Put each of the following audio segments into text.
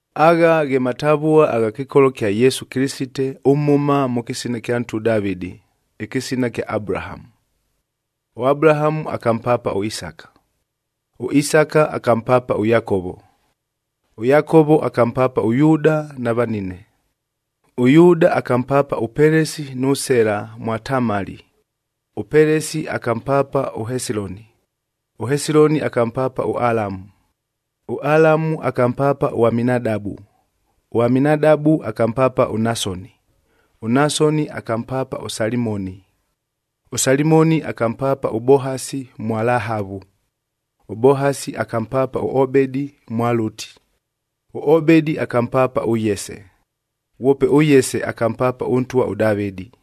Agha ghe matavua agha kɨkolo kya Yesu Kɨlɨsitea ʉmhʉma mʉ kɨsina kya ntwa ʉDavɨdi, ɨkɨsina kya Abulahamu. ɄAbulahamu akampaapa ʉIsaka, ʉIsaka akampaapa ʉYakovo, ʉYakovo akampaapa ʉYuuda na vanine. ɄYuuda akampaapa ʉPelesi nʉ Sela mwa Tamali, ʉPelesi akampaapa ʉHesiloni, ʉHesiloni akampaapa ʉAlamu. ɄAlamu akampaapa ʉAminadabu, ʉAminadabu akampaapa ʉNasoni, ʉNasoni akampaapa ʉSalimoni. ɄSalimoni akampaapa ʉBohasi mwa Lahavu, ʉBohasi akampaapa ʉObedi mwa Lʉti, ʉObedi akampaapa ʉYese, ghwope ʉYese akampaapa ʉntwa ʉDavɨdi.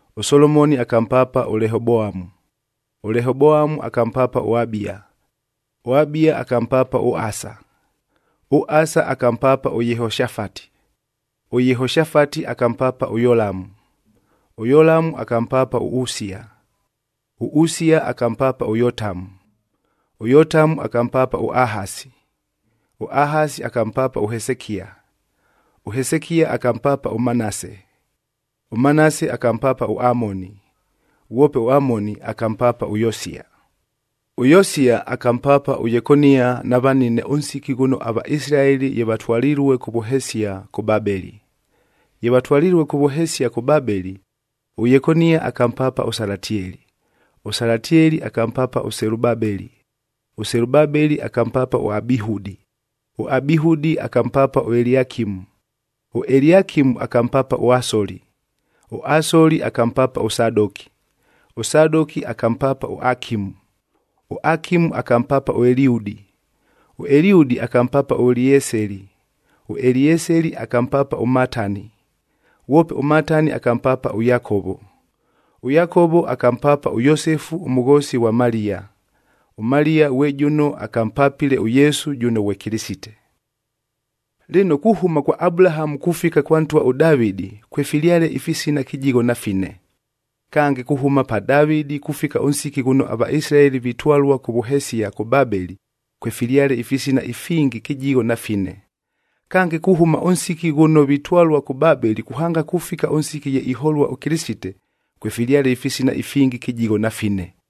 ɄSolomoni akampaapa ʉLehoboamu, ʉLehoboamu akampaapa ʉAbia, ʉAbia akampaapa ʉAsa. ɄAsa akampaapa ʉYehoshafati, ʉYehoshafati akampaapa ʉYolamu, ʉYolamu akampaapa ʉUsia. ɄUsia akampaapa ʉYotamu, ʉYotamu akampaapa ʉAhasi, ʉAhasi akampaapa ʉHesekia. ɄHesekia akampaapa ʉManase, ʉManase akampaapa ʉAmoni, ghwope ʉAmoni akampaapa ʉYosia. ɄYosia akampaapa ʉYekonia na vanine ʉnsiki ghʉno aVaisilaeli ye vatwalilue kʉ vʉhesia, kʉ Babeli. Ye vatwalilue kʉ vʉhesia kʉ Babeli, ʉYekonia akampaapa ʉSalatieli, ʉSalatieli akampaapa ʉSelubabeli. ɄSelubabeli akampaapa ʉAbihudi, ʉAbihudi akampaapa ʉEliakimu, ʉEliakimu akampaapa ʉAsoli. ɄAsoli akampaapa ʉSadoki, ʉSadoki akampaapa ʉAkimu, ʉAkimu akampaapa ʉEliudi. ɄEliudi akampaapa ʉElieseli, ʉElieseli akampaapa ʉMatani, ghwope ʉMatani akampaapa ʉYakovo. ɄYakovo akampaapa ʉYosefu ʉmʉghoosi ghwa Maliya. ɄMaliya ghwe jʉno akampapile ʉYesu jʉno ghwe Kɨlɨsite. Lɨno, kuhʉma kwa Abulahamu kufika kwa ntwa ʉDavɨdi kwefilyale ifisina kɨjigho na fine. Kange, kuhʉma pa Davɨdi kufika ʉnsiki ghʉno aVaisilaeli vitwalua kʉ vʉhesia kʉ Babeli, kwefilyale ifisina ifingi kɨjigho na fine. Kange, kuhʉma ʉnsiki ghʉno vitwalua kʉ Babeli kuhanga kufika ʉnsiki ye iholua ʉKɨlɨsite, kwefilyale ifisina ifingi kɨjigho na fine.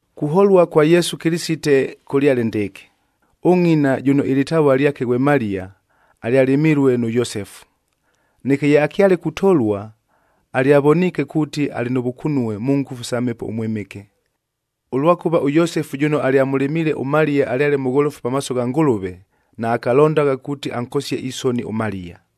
Kuholua kwa Yesu Kɨlɨsite kʉlyale ndɨɨkɨ: Ʉngʼina jʉno ɨlɨtavua lyake ghwe Maliya, alyalɨmilue nʉ Yosefu. Neke ye akyale kutolua, alyavoniike kuuti, alɨ nʉ vʉkunue mʉ ngʉfu sa Mhepo ʉMwɨmɨke. Ʉlwakʉva ʉYosefu jʉno alyamʉlɨmiile ʉMaliya alyale mʉgholofu pamaaso gha Ngʉlʉve, naakalondagha kuuti ankosie isoni ʉMaliya.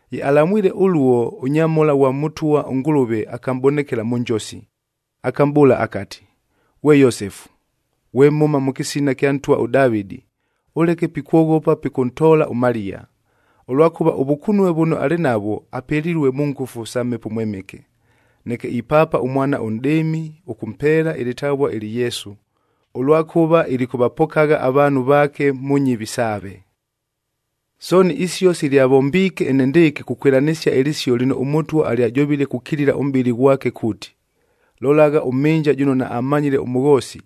Ye alamwile ʉluo, ʉnyamhola ghwa Mʉtwa ʉNgʉlʉve akamʼbonekela mʉ njosi, akamʼbʉʉla akati, “Ghwe Yosefu, ghwe mhʉma mʉ kɨsina ɨkya ntwa ʉDavɨdi,d ʉleke pikwoghopa pikʉntoola ʉMaliya, ʉlwakʉva ʉvʉkunue vʉno alɨ navwo, apelilue mʉ ngʉfu sa Mhepo ʉMwɨmɨke. Neke ipaapa ʉmwana ʉnʼdɨɨmi, ʉkʉmpeela ɨlɨtavua ɨlɨ Yesu,e ʉlwakʉva ilikʉvapokagha avaanhu vaake mʉ nyɨvi saave.” Sooni isio silyavombiike enendɨɨkɨ kukwɨlanɨsia ɨlɨsio lɨno ʉMʉtwa alyajovile kukilila ʉmʼbɨli ghwake kuuti, “Lolagha, ʉmhɨnja jʉno naammanyile ʉmʉghoosi,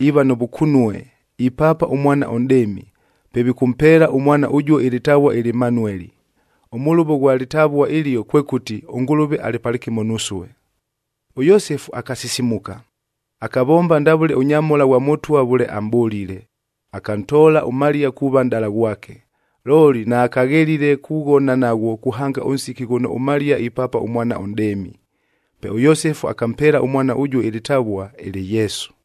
iiva nʉ vʉkunue, ipaapa ʉmwana ʉnʼdɨɨmi! Pe vikʉmpeela ʉmwana ʉjuo ɨlɨtavua ɨlɨ Manueli.”f Ʉmʉlʉvo ghwa lɨtavua ɨlio kwekʉti, “ɄNgʉlʉve alɨ palɨkɨmo nusue.” ɄYosefu akasisimuka, akavomba ndavʉle ʉnyamhola ghwa Mʉtwa vʉle amʼbʉlile, akantoola ʉMaliya kuuva nʼdala ghwake. Looli naakaghelile kughona naghwo kuhanga ʉnsiki ghʉno ʉMaliya ipaapa ʉmwana ʉnʼdɨɨmi. Pe ʉYosefu akampeela ʉmwana ʉjuo ɨlɨtavua ɨlɨ Yesu.